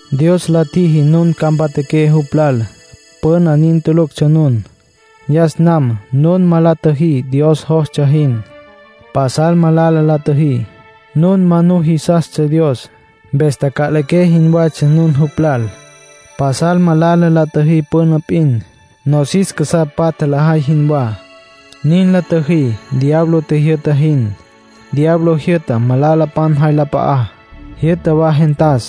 Dios la tjiji nun ca mpatjaqué jupj lal. Püna nin tuluctsja nun. Yas nam nun ma la tjüjí Dios jostsja jin. Pasal malala la tjüjí. Nun ma nujisastsja Dios, mpes taca'liqué jinwatsja nun jupj lal. Pasal malala la tjüjí püna p'in, nosis casá patja lajay jinwá. Nin la tjüjí diablo tjijyü'ta jin. Diablo jyü'ta malalapan jay la p'a'á. Jyü'ta wa gentas,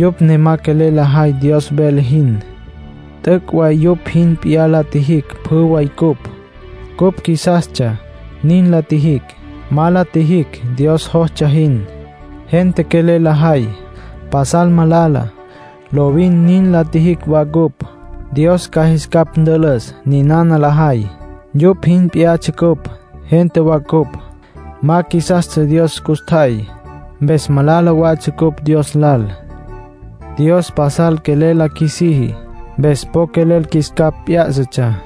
yupj ne ma quelel lajay Dios vele jin. T'üc' way yupj jin p'iyá la tjijicj pjü way cupj. Cupj qjuisastsja, nin la tjijicj. Ma la tjijicj Dios jostsja jin. Gente quelel lajay, pasal malala. Lovin nin la tjijicj wa cupj. Dios ca jis capj ntülüs ninana lajay. Yupj jin p'iyatsja cupj; gente wa cupj, ma qjuisastsja Dios custjay. Mpes malala watsja ncupj Dios lal. Dios pasal quelel la qjuisiji, mpes po quelel qjuis capj p'yá'satsja.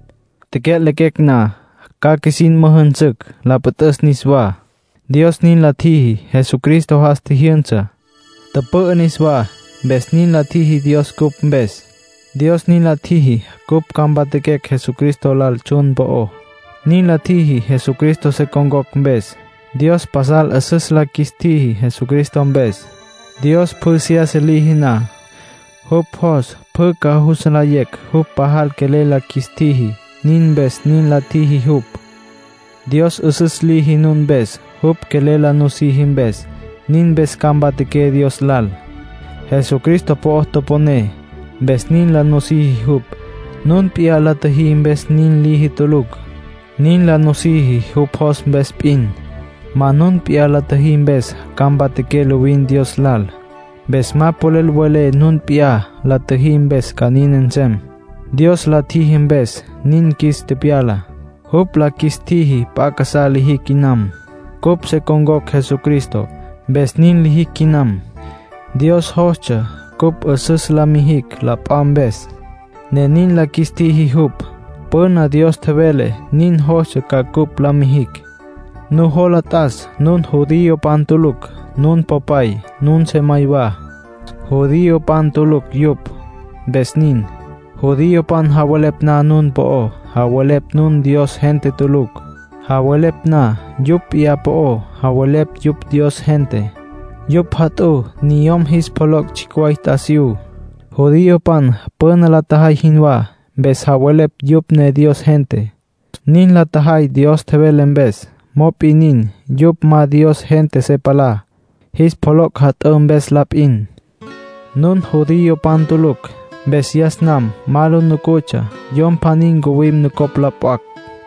Tecya'lequecj na, ca qjuisin müjünsücj la püt'üs niswá, Dios nin la tjiji. Jesucristo jas tjijyünsa, tüpü'ü niswá, mpes nin la tjiji Dios cupj mpes. Dios nin la tjiji cupj ca mpatjaquecj Jesucristo lal tsjun po'ó. Nin la tjiji Jesucristo se con̈cocj mpes. Dios pasal 'üsüs la qjuis tjiji Jesucristo mpes. Dios pjü seyasa liji na, jupj jos pjü ca jus nlayecj jupj pajal quelel la qjuis tjiji; nin mpes nin la tjiji jupj. Dios 'üsüs liji nun mpes, jupj quelel la nusiji mpes; nin mpes ca mpatjaqué Dios lal. Jesucristo po'o toponé, mpes nin la nusiji jupj. Nun p'iyá la tjüjí mpes nin liji tulucj. Nin la nusiji, jupj jos mpes p'in. Ma nun p'iyá la tjüjí mpes ca mpatjaqué lovin Dios lal. Mpes ma polel welé nun p'iyá la tjüjí mpes ca nin nsem. Dios la tjiji mpes nin qjuis tepyala. Jupj la qjuis tjiji p'a casá lijicj quinam. Cupj se con̈cocj Jesucristo, mpes nin lijicj quinam. Dios jostsja cupj 'üsüs la mijicj la p'a mpes, ne nin la qjuis tjiji jupj. Püna Dios tjevele nin jostsja ca cupj la mijicj. Nujola t'as nun judiopan tulucj. Nun popay, nun sejamay wa, judiopan tulucj yupj, mpes nin. Judiopan javelepj na nun po'ó, javelepj nun Dios gente tulucj. Javelepj na yupj p'iyá po'ó, javelepj yupj Dios gente. Yupj jat'ǘ niyom jis pjoloc' tsjicj way t'asiyú, judiopan püna la tjajay jinwá, mpes javelepj yupj ne Dios gente. Nin la tjajay Dios tjevele mpes. Mop'in nin, yupj ma Dios gente se palá, jis pjoloc' jat'ǘ mpes la p'in. Nun judiopan tulucj, mpes yas nam ma lu nucutsja Yom pjaní ncuwim nucopj lo p'acj.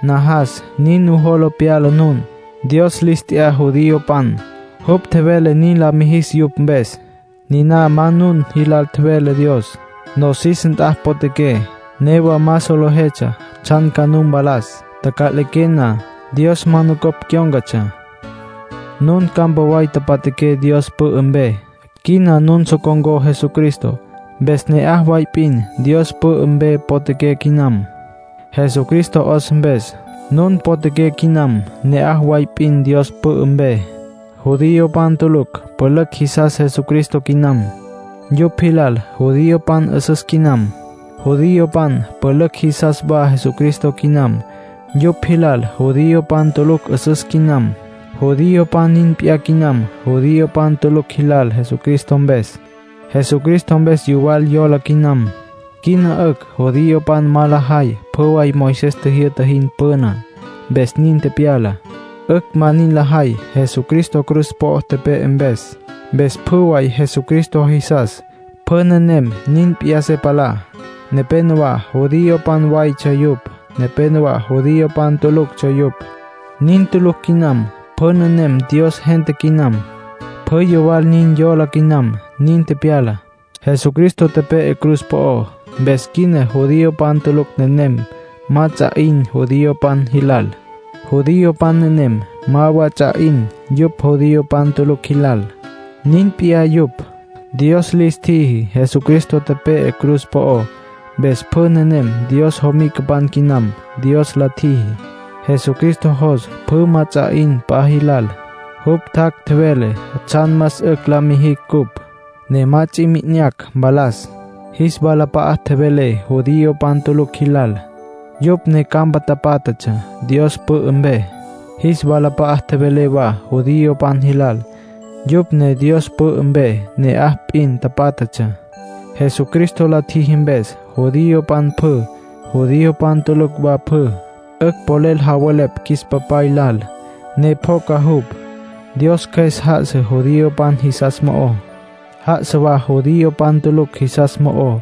Najas nin nujola pyala nun. Dios lis t'ya judiopan. Jupj tjevele nin la mijis yupj mpes. Niná ma nun jilal tjevele Dios. Nosis nt'a potjaqué, newa ma solejetsja tsjan ca nu mpalas, taca'liqué na. Dios ma nucopj cyón̈catsja. Nun campa way tapatjaqué Dios pü'ü mpe. Quina nun so con̈có Jesucristo. Mpes ne'aj way p'in Dios pü'ü mpe potjaqué quinam. Jesucristo 'os mpes, nun potjaqué quinam ne'aj way p'in Dios pü'ü mpe. Judiopan tulucj pülücj jisas Jesucristo quinam. Yupj jilal judiopan 'üsüs quinam. Judiopan pülücj jisas wa Jesucristo quinam. Yupj jilal judiopan tulucj 'üsüs quinam. Judiopan nin p'iyá quinam judiopan tulucj jilal Jesucristo mpes. Jesucristo mpes, yuwal yola quinam. Quina 'ücj judiopan ma lajay pjü way Moisés tjijyü'ta jin püná, mpes nin tepyala. 'Ücj ma nin lajay, Jesucristo cruz po'o tepe'e mpes. Mpes pjü way Jesucristo jisas, pjü nenem nin p'iyá se palá. Nepénowa judiopan waytsja yupj. Nepénowa judiopan tuluctsja yupj. Nin tulucj quinam. Pjü nenem Dios gente quinam. Pjü yuwal nin yola quinam, nin pyala. Jesucristo tepe'e cruz po'ó, mpes quina judiopan tulucj nenem ma ts'a 'in judiopan jilal. Judiopan nenem ma wa ts'a 'in yupj judiopan tulucj jilal. Nin p'iyá yupj, Dios lis tjiji. Jesucristo tepe'e cruz po'ó, mpes pjü nenem Dios jomicapan quinam, Dios la tjiji. Jesucristo jos pjü ma ts'a 'in p'a jilal. Jupj tjac', tjevele tsjan más 'ücj la mijicj cupj, ne ma ts'i mi'inacj mpalas. Jis walap'a'a tjevele judiopan tulucj jilal, yupj ne campa tapátjatsja Dios pü'ü mpe. Jis walap'a'a tjevele wa judiopan jilal, yupj ne Dios pü'ü mpe ne'aj p'in tapátjatsja. Jesucristo la tjiji mpes, judiopan pjü, judiopan tulucj wa pjü, 'ücj polel javelepj qjuis Papay lal, ne pjoca jupj. Dios Cjües já'asa judiopan jisas mo'ó, já'asa wa judiopan tulucj jisas mo'ó,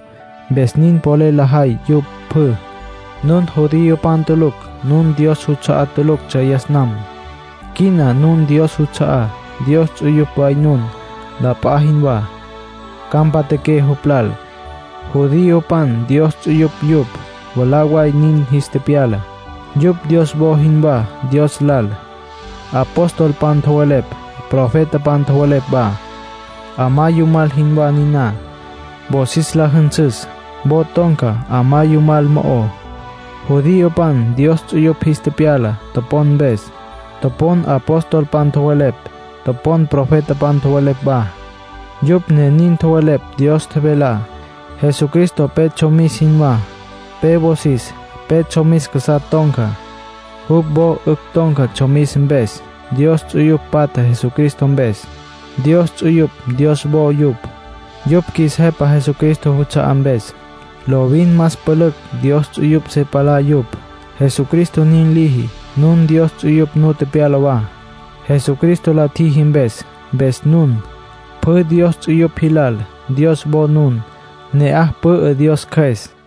mpes nin polel lajay yupj pjü. Nun judiopan tulucj. Nun Dios juts'a'á tuluctsja yas nam. Quina nun Dios juts'a'á, Dios ts'uyupj way nun, la p'a jinwá. Ca mpatjaqué jupj lal. Judiopan Dios ts'uyupj yupj, mwalá way nin jis tepyala. Yupj Dios wo jinwá Dios lal. Apostolpan tjowelepj, profetapan tjowelepj wa, 'amá yumal jinwá niná, wosis la jünsüs. Wo ton̈ca 'amá yumal mo'ó. Judiopan Dios ts'uyupj jis tepyala, topon mpes. Topon apostolpan tjowelepj, topon profetapan tjowelepj wa. Yupj ne nin tjowelepj Dios tjevelá. Jesucristo pe tsjomis jinwá. Pe wosis pe tsjomis casá ton̈ca. Jupj wo 'ücj ton̈ca tsjomis mpes. Dios ts'uyupj patja Jesucristo mpes. Dios ts'uyupj Dios wo yupj, yupj qjuis Jepa Jesucristo juts'a'á mpes. Lovin más pülücj Dios ts'uyupj se palá yupj, Jesucristo nin liji. Nun Dios ts'uyupj nu tepyala wa, Jesucristo la tjiji mpes. Mpes nun, pjü Dios ts'uyupj jilal, Dios wo nun. Ne'aj pü'ü Dios Cjües.